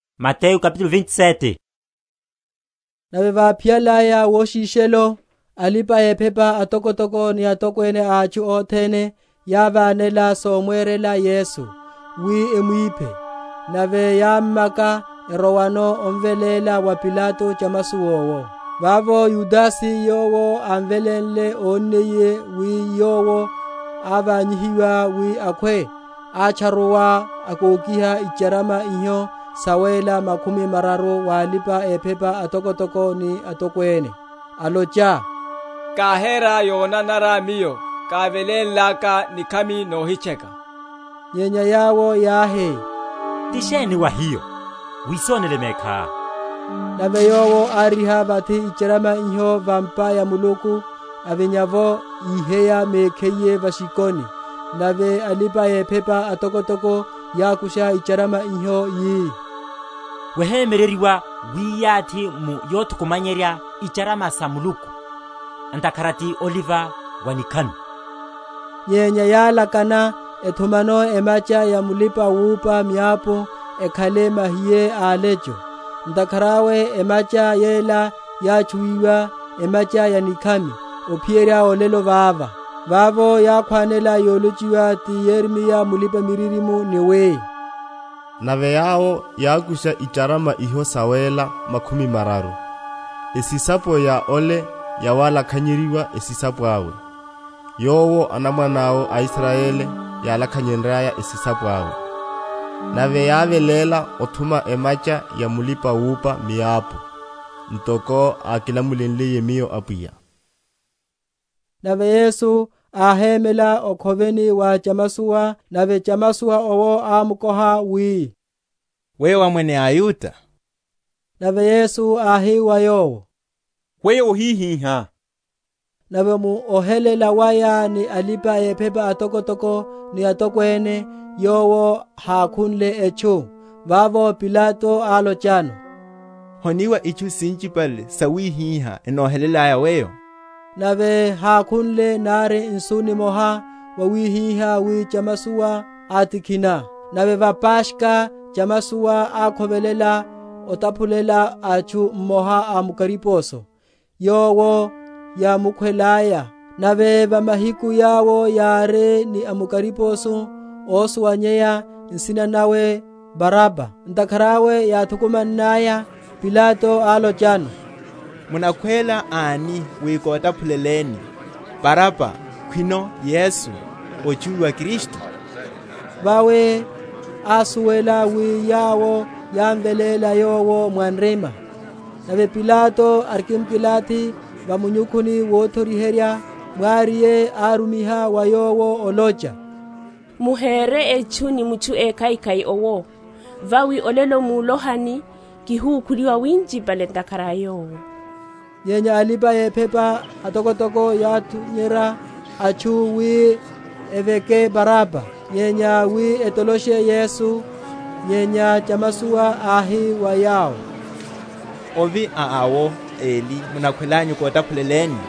Wiheya wa Yudase. Nave vaphiyalaya woshishelo, alipa‐ephepa atokotoko ni atokwene a atchu othene yávánela somwerela Yesu, wi emwiphe: nave yámmaka, erowano, emveléla wa Pilato chamasowa owo. Vavo Yudase yowo ámvelénle, ónniye wi Yowo ávanyihiwa wi akhwe, átcharuwa, akokiha icharama iho sawéla makhumi mararu wa alipa‐ephepa atokotoko ni atokwene, alocha, Káhera yonanara miyo, kávelénlaka nikhami nohitcheka. Nyenya yawo yáhi, Ti sheni wa hiyo? wisonele mekhá. Nave yowo áriha vathi icharama iho va’mpa ya Muluku, avinya’vo, íheya mekhiye va’shikoni. Nave alipa‐ephepa atokotoko yákusha icharama iho, yi, Wohemyereryiwa wiyathi mu yothukumanyiherya icharama sa Muluku, ntakhara ti oliva wa nikhami. Nyenya yálakana, ethumano emacha ya mulipa‐wúpa miapu, ekhale mahiye a alecho. Ntakhara awe emacha yela yátchuwiwa, Emacha‐ya‐nikhami, ophiyerya olelo vava. Vavo yákhwanela yolochiwa ti Yeremiya mulipa‐miririmo, ni wi, Nave yawo yákusha icharama iho sawéla makhumi mararu, Esisapo ya ole yawalakhanyeryiwa esisapo awe, Yowo anamwane awo a Israyeli yálakhanyenryaya esisapo awe; Nave yáveléla othuma emacha ya mulipa‐wúpa miapu, Ntoko ákilamulenliye miyo Apwiya. Yesu wa Pilato. Nave Yesu áhémela okhoveni wa chamasowa, nave chamasowa owo ámkoha wi, Weyo wá Mwene a aYuda? Nave Yesu áhi wa yowo, Weyo wohihihá. Nave mu ohelela waya ni alipa‐ephepa atokotoko ni atokwene, Yowo hákhunle etchu. Vavo Pilato álochano, Honiwa itchu sinchipale sawihiha enohelelaya Weyo? Nave hákhunle, nari nsu nimoha, wawihihá wi chamasowa átikhina. Nave va Paskha chamasowa ákhovelela otaphulela atchu mmoha a mukariposo, yowo yámukhwelaya. Nave va mahiku yawo yári ni a mukariposo ósuwanyeya, nsina nawe, Baraba. Ntakhara awe yáthukumannaya, Pilato álochano, Munakhwela ani wi kotaphuleleni? Baraba khwino Yesu, ótchuwiwa Kristu? Vawi ásuwela wi yawo yámveléla Yowo mwa nrima. Nave Pilato arikimkilathi va munyukhuni wothoriherya, mwariye árumiha wa yowo olocha, Muhere etchu ni mutchu ékhaikhai owo; vawi olelo mulohani kihukhuliwa winchipale ntakhara a Yowo. Nyenya alipa‐ephepa atokotoko yátunyerya atchu wi eveke Baraba, nyenya wi etoloshe Yesu. Nyenya chamasowa áhi wa yawo, Ovi a awo eli munakhwelanyu kotaphuleleni?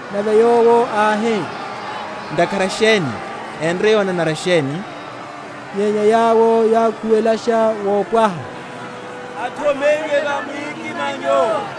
Nave yowo áhi, Ntakhara sheni? enre yonanara sheni? Nyenya yawo yákhuwelasha wopwaha, Athomeyiwe va mwikimanyo.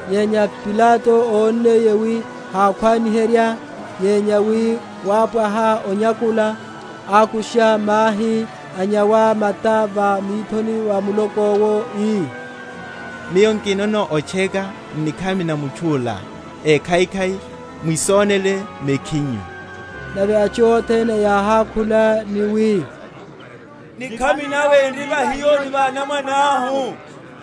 Nyenya Pilato ónniye wi hákhwani?-?herya, nyenya wi wápwaha onyakula, ákusha mahi, anyawa mata va mithoni va muloko’wo, ii, Miyo nkinono otcheka n’nikhami na mutchu’la ékhaikhai, mwisonele mekhinyu. Nave atchu othene yáhákhula, ni wi, Nikhami nawe n’ri va hiyo ni va anamwanahu.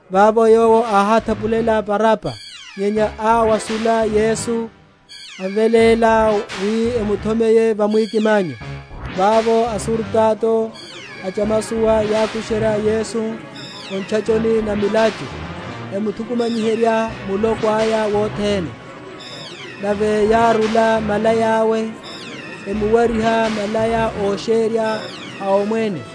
Vavo yowo áhátaphulela Baraba, nyenya áwashula Yesu, amveléla wi emuthomeye va mwikimanyo. Vavo asurutato a chamasowa yákusherya Yesu o ntchachoni na milachu, emuthukumanyiherya muloko aya wothene. Nave yárula malaya awe, emuwariha malaya ósherya a omwene.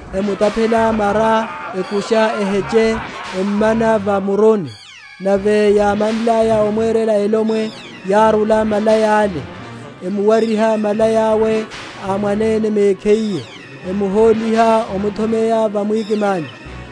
Emutaphela mara, ekusha eheche, emmana va muruni. Nave yámanlaya omwerela elomwe, yárula malaya’le, emuwariha malaya’we a mwanene mekhiye, emuhóliha omuthomeya va mwikimanyo. Othomeyiwa wa Yesu.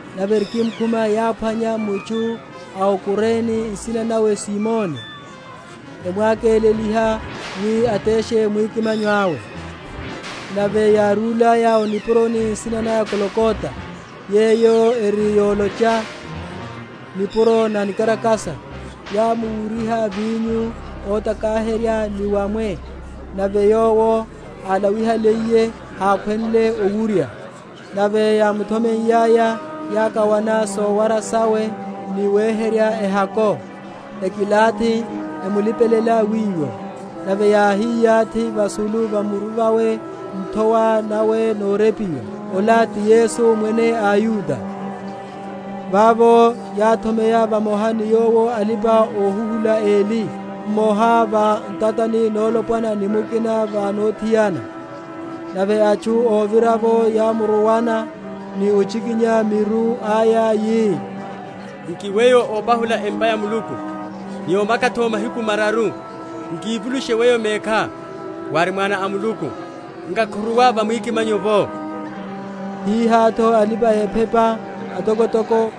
Nave erikimkhuma yáphwanya mutchu a o Kurene, nsina nawe Simoni, emwakéleliha wi ateshe mwikimanyo awe. Nave yárúlaya o nipuroni nsina naya Golgota, yeyo eri yolocha, Nipuro‐na‐nikarakasa, yámuwuryiha vinyo otakaherya ni wamwe; nave Yowo álawihaliye, hákhwenle owurya. Nave yámuthomeiyaya, yákawana sowara sawe ni weherya ehako: ekilathi, emulipelela wiwo. Nave yáhiyathi vasulu va muru vawe nthowa nawe norepiwa: Ola ti Yesu Mwene a aYuda. Vavo yáthomeya vamoha ni Yowo alipa‐ohuhula eli, mmoha va ntatani nolopwana ni mukina va nothiana. Nave atchu óvira’vo yámuruwana, ni ochikinya miru aya, yi, Nki Weyo ópahula empa ya Muluku, ni omaka’tho m’mahiku mararu, nkivulushe Weyo mekhá: wári Mwana a Muluku, nkakhuruwa va mwikimanyo’vo. Hihá’tho alipa‐ephepa atokotoko,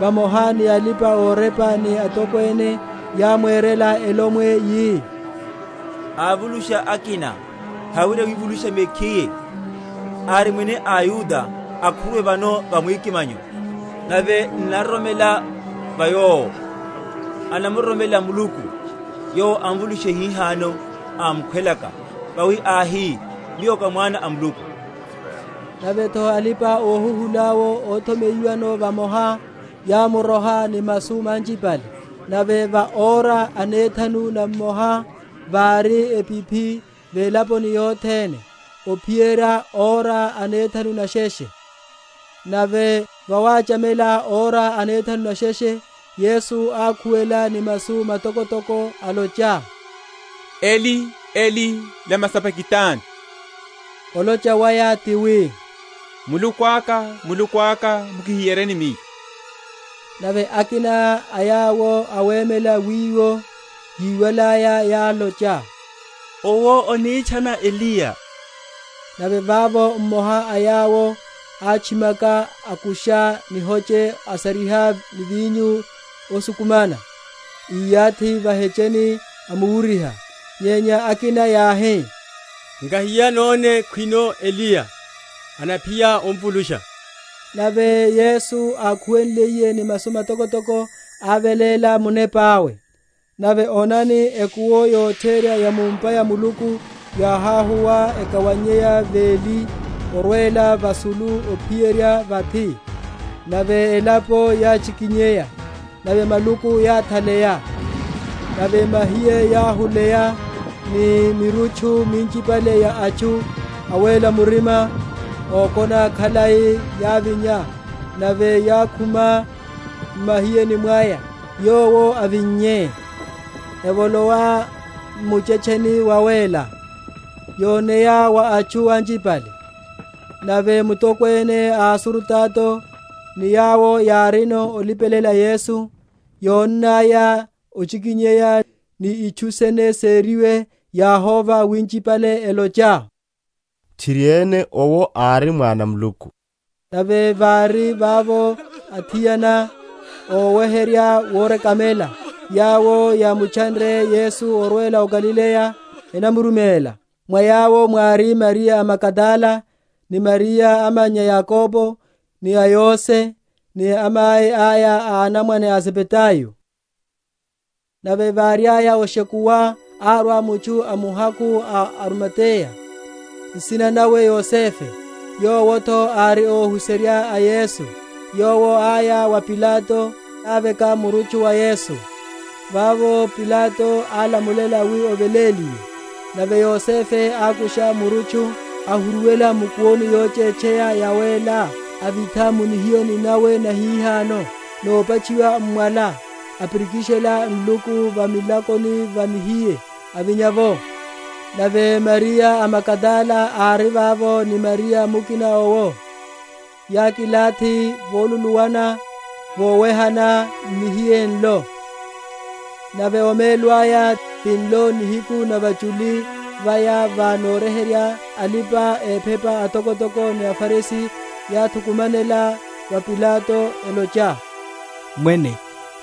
vamoha ni alipa‐orepa ni atokwene yámwerela elomwe, yi, Avulusha akina, hawerya wivulusha mekhiye. Ari Mwene a aYuda: akhuruwe vano va mwikimanyo, nave n’naroromela va Yowo. Annaroromela Muluku; Yowo amvulushe hihano, ámkhwelaka: vawi áhi, Miyo ká Mwana a Muluku. Nave’tho alipa‐ohuhula’wo óthomeyiwano vamoha, yámuroha ni masu manchipale. Nave va ora anethanu namoha vári epiphi velaponi yothene, ophiyerya ora anethanu nesheshe. Nave vawachamela ora anethanu nesheshe, Yesu ákhuwela ni masu matokotoko, olocha, Eli, Eli, Lama sabakitani? olocha waya ti wi, Muluku aka, Muluku aka, mukihiyeryeni Miyo? Nave akina a yawo awemela wiwo, yíwalaya, yálocha, Owo anitchana Eliya. Nave vavo mmoha a yawo átchimaka, akusha nihoche, asariha ni vinyo osukumana, iyathi va’hecheni, amuwuryiha. Nyenya akina yáhi, Nkahiya, none khwino Eliya anaphiya omvulusha. Nave Yesu, ákhuwenliye ni masu matokotoko, áveléla munepa awe. Nave onani, ekuwo yotherya ya mu’mpa ya Muluku yáháhuwa ekawaneya veli orwela vasulu ophiyerya vathi; nave elapo yáchikinyeya, nave maluku yáthaleya; nave mahiye yáhuleya, ni mirutchu minchipale ya atchu awéla murima, ókona khalai, yávinya; nave yákhuma m’mahiyeni mwaya, Yowo avinnye, evolowa m’muchetcheni wawéla, yoneya wa atchu anchipale. Nave mutokwene a asurutato, ni yawo yárino olipelela Yesu, yónnaya ochikinyeya, ni itchu sene seriwe, yáhova winchipale, elocha, Tchiriene owo ári Mwana a Muluku. Nave vári vavo athiana, óweherya vorekamela, yawo yámutchanre Yesu orwela o Galileya, enamuruméla: mwa yawo mwári Mariya a Magadala, ni Mariya amannya a Yakobo, ni a Yose, ni amai aya a anamwane a Zebedayo. Ovithiwa wawe mu nihiyeni. Nave váriaya oshekuwa, árwa mutchu amuhakhu a o Arimateya, nsina nawe Yosefe, yowo’tho ári óhuserya a Yesu: yowo áya wa Pilato, aveka murutchu wa Yesu. Vavo Pilato álamulela wi oveléliwe. Nave Yosefe ákusha murutchu, ahuruwela mu’kuwoni yochetcheya yawéla, avitha mu nihiyeni nawe nahihano, nopatchiwa m’mwala, apirikishela nluku va milakoni va nihiye, avinya’vo. Nave Mariya a Magadala ári vavo, ni Mariya mukina owo, yákilathi voluluwana, vowehana n’nihiye nlo. Nave omelo aya, tinlo nihiku na vachuli vaya va Noryeherya, alipa‐ephepa atokotoko ni aFarisi yáthukumanela wa Pilato, elocha, Mwene,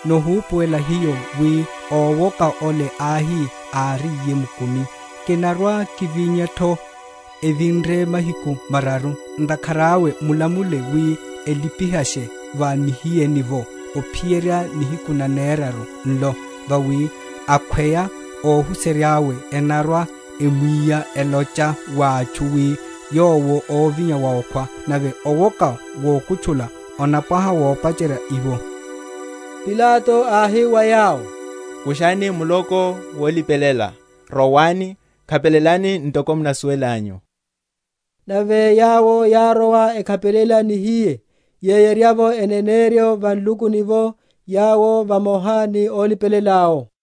nohupuwela hiyo, wi ówoka ole áhi, áriye mkumi, Kinarwa‐kivinya’tho evinre mahiku mararu. Ntakhara awe mulamule wi elipihashe va nihiyeni’vo, ophiyerya nihiku naneraru nlo, vawi akhweya óhuserya’we enarwe, emwiya, elocha wa atchu, wi Yowo ávinya wa okhwa: nave owoka wokutchula onapwaha wopacherya iwo. Pilato áhi wa yawo, Kushani muloko wolipelela, rowani, khapelelani ntoko munasuwelelanyu. Nave yawo yárowa, ekhapelela nihiye, yeyerya’vo eneneryo va nlukuni’vo, yawo vamoha ni ólipelela’wo.